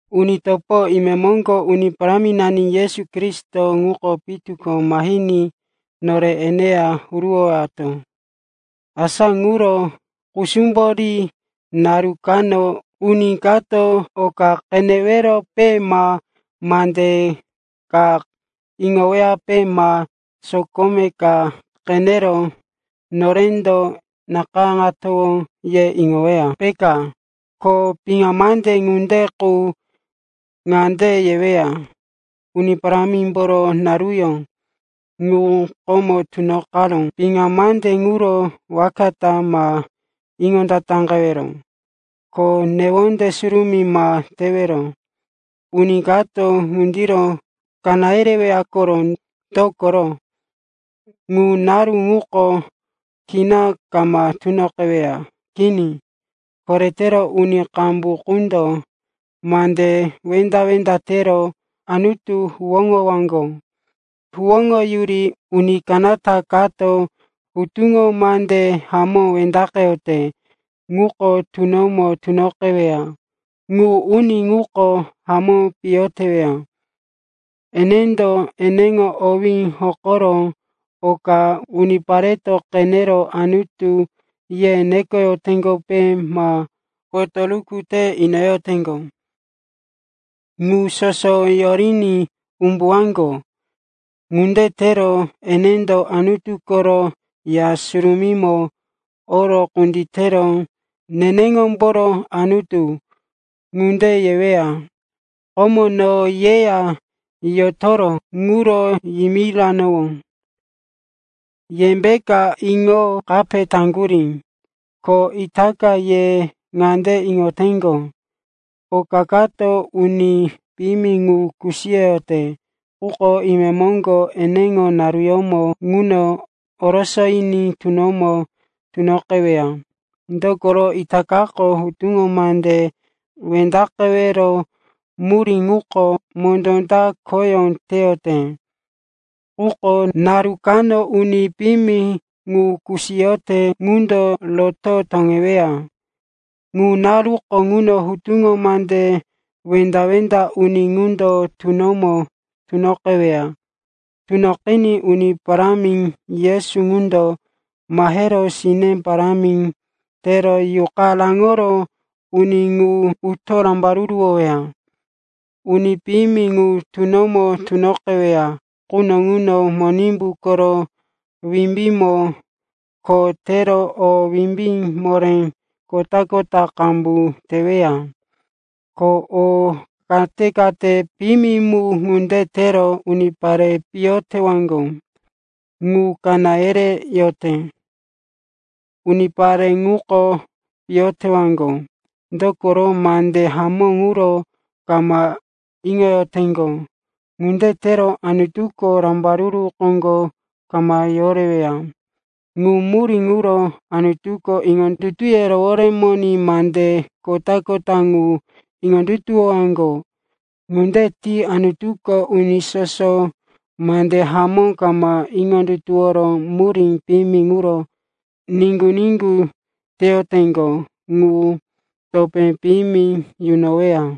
Uni topo, imemoŋgo Uni Paráminani Yesu Kristo ŋuko pitu ko mahiní nore eneya huruwowato. Asa ŋuro kusumbo ri. Naru kano uni kato quko oka qeneweyape ma mande ka iŋoweyape ma sokome ka qenero norendo nakayáŋatowó ye iŋoweya, peka. Ko piŋa mande ŋunde qu ŋande yeweya, Uni Parámimboro naruyó ŋu komo tunoqaró. Piŋa mande ŋuro waka ta ma iŋondataqewero, ko newonde surumí ma tewero. Uni kato ŋundiro kaná yereweya koro. Dokoro ŋu naru ŋuko kina kama tunoqeweya. Kini, koretero uni qambu qundo mande wenda-wenda tero Anutu huwóŋowaŋgo. Huwóŋoyuri uni kanata kato hutuŋo mande hamó wendaqeyote ŋuko tunomo tunoqeweya, ŋu uni ŋuko hamó piyo teweya. Enendo eneŋo owí hokoro oka unipareto qenero, anutu, ye nekoyoteŋgope ma potoruku te inoyoteŋgo, ŋu soso yoriní umbuwaŋgo. Ŋunde tero enendo Anutu koro Ya Surumímo oro kunditero, “Neneŋombo Anutu,” ŋunde yeweya. Komo no yeya yotoro ŋuro yimiranowó. Yembeka iŋo kape taŋgurí? Ko itaka ye ŋande iŋoteŋgo, oka kato uni piyimi ŋu kusiyoyote, quko imemoŋgo, eneŋo naruyómo ŋuno, orosoyiní tunomo tunoqeweya. Dokoro itakako hutuŋo mande wendaqewero murí ŋuko mondó ta khoyó teyote. Quko naru kano uni piyimi ŋu kusiyote ŋundo roto toŋeweya. Ŋu naruko ŋuno hutuŋo mande wenda-wenda uni ŋundo tunomo tunoqeweya. Tunoqiní Uni Parámi Yesu ŋundo mahero sine parámi tero yuqa raŋoro uni ŋu utoro rambaruruwoweya. Uni piyimi ŋu tunomo tunoqeweya quno ŋuno Monimbu koro wimbímo kho tero o wimbí moré kota-kota qambu teweya. Ko o kate-kate piyimi mu ŋunde tero unipare piyo tewaŋgo ŋu kaná yereyote. Unipare ŋuko piyo tewaŋgo, dokoro mande hamó ŋuro kama iŋoyoteŋgo. Ŋunde tero Anutuko rambaruru koŋgo kama yoreweya. Ŋu murí ŋuro Anutuko iŋondutuye roworemoní mande kota-kota ŋu iŋondutuwowaŋgo. Ŋunde ti Anutuko uni soso mande hamó kama iŋondutuworo murí piyimi ŋuro niŋgu-niŋgu teyoteŋgo ŋu topé piyimi yunoweya.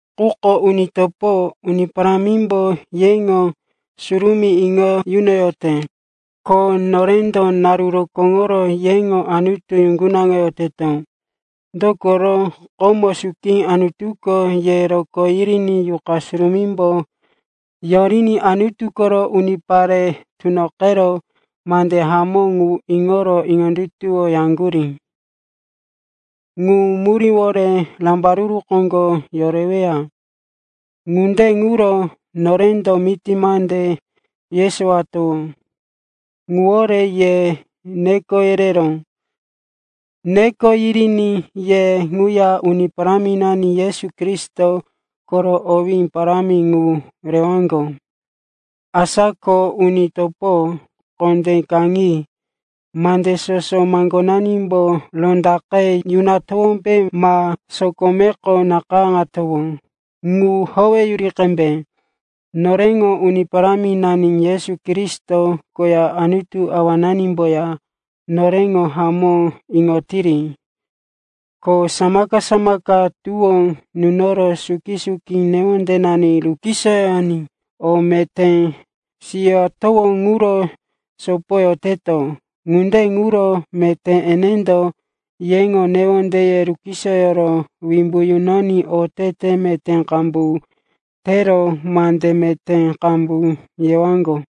Quko uni topo, Uni Parámimbo yeŋo surumí iŋo yunoyote, ko norendo naru rokóŋo yeŋo Anutu yuŋgunaŋoyoteto. Dokoro komo suki Anutuko ye rokó yiriní Yuqa Surumímbo yoriní Anutu koro unipare tunoqero mande hamó ŋu iŋoro iŋondutuwoyaŋgurí. Ŋu muríwore rambaruru koŋgo yoreweya. Ŋunde ŋuro norendo miti mande yesowatowó ŋuwore ye neko yereró. Neko yiriní ye ŋuya Uni Paráminani Yesu Kristo koro owé parámi ŋu rewaŋgo. Asa ko uni topo, kondé kaŋi. Mande soso maŋgonanimbo rondaqe yunatowómbe ma sokomeko nakayáŋatowó ŋu howeyuri qembe. Noreŋo Uni Paráminani Yesu Kristo koya Anutu Awananimboya noreŋo hamó iŋoyotiri. Ko samaka-samaka tuwó nunoro suki-suki newondenani rukisoyoní o meté siyowato ŋuro sopoyoteto. Ŋunde ŋuro meté enendo yeŋo newondeye rukisoyoro wimbu yunoní otete meté qambu tero mande meté qambu yewaŋgo.